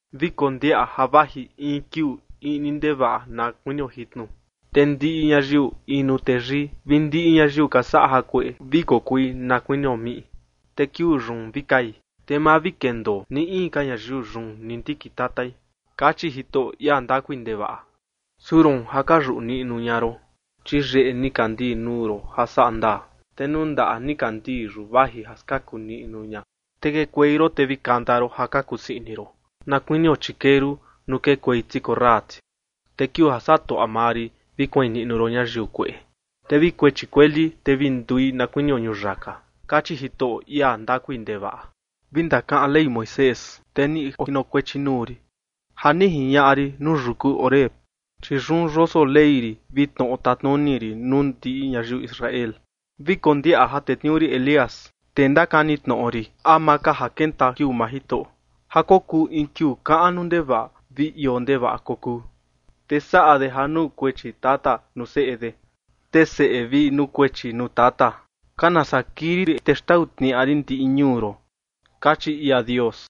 “Vi kondiaꞌa ja vaji in kiuu iꞌni ndevaꞌa na kuinio jitnu, te ndiꞌi ñayiu inu teyii vi ndiꞌi ñayiu ka saꞌa ja kueꞌe vi kokui na kuinio miꞌi, te kiuu yun vi kai, te ma vi kendoo ni in ka ñayiu yun ni ndikin tatai”, kachi Jitoꞌo, ia ndakui ndevaꞌa. “Su roon ja ka yuꞌu niꞌnu ña ron, chi yeꞌe nikandii nuu ron ja saꞌa ndaa, te nuu ndaꞌa nikandii yun vaji ja skaku niꞌnu ña, te kekuei ron te vi kanta ron ja ka kusii ini ron, na kuinio chikeru nuu kekuei ti korra ti. Te kiuu ja saꞌa tuaꞌa maa rin vi kuain niꞌnu ron ñayiu kueꞌe, te vi kuechi kueli, te vi ndui na kuinio ñuyaka”, kachi Jitoꞌo, ia ndakui ndevaꞌa. “Vi ndakaꞌan Ley Moisés, tee ni ojinokuechi nuu rin, ja ni jiñaꞌa rin nuu yuku Horeb, chi yun yoso Ley rin vi tnoꞌo tatnuni rin nuu ndiꞌi ñayiu Israel. ’Vi kondiaꞌa ja tetniuu rin Elías, tee ndakani tnoꞌo rin, ama ka ja kenta kiuu maa Jitoꞌo, ja kokuu in kiuu kaꞌnu ndevaꞌa vi ioo ndevaꞌa kokuu. Te saꞌa de ja nukuechi tata nuu seꞌe de, te seꞌe vi nukuechi nuu tata. Kana saa kii rin te xtau tniaꞌa rin ndiꞌi ñuu ron”, kachi ia Dios.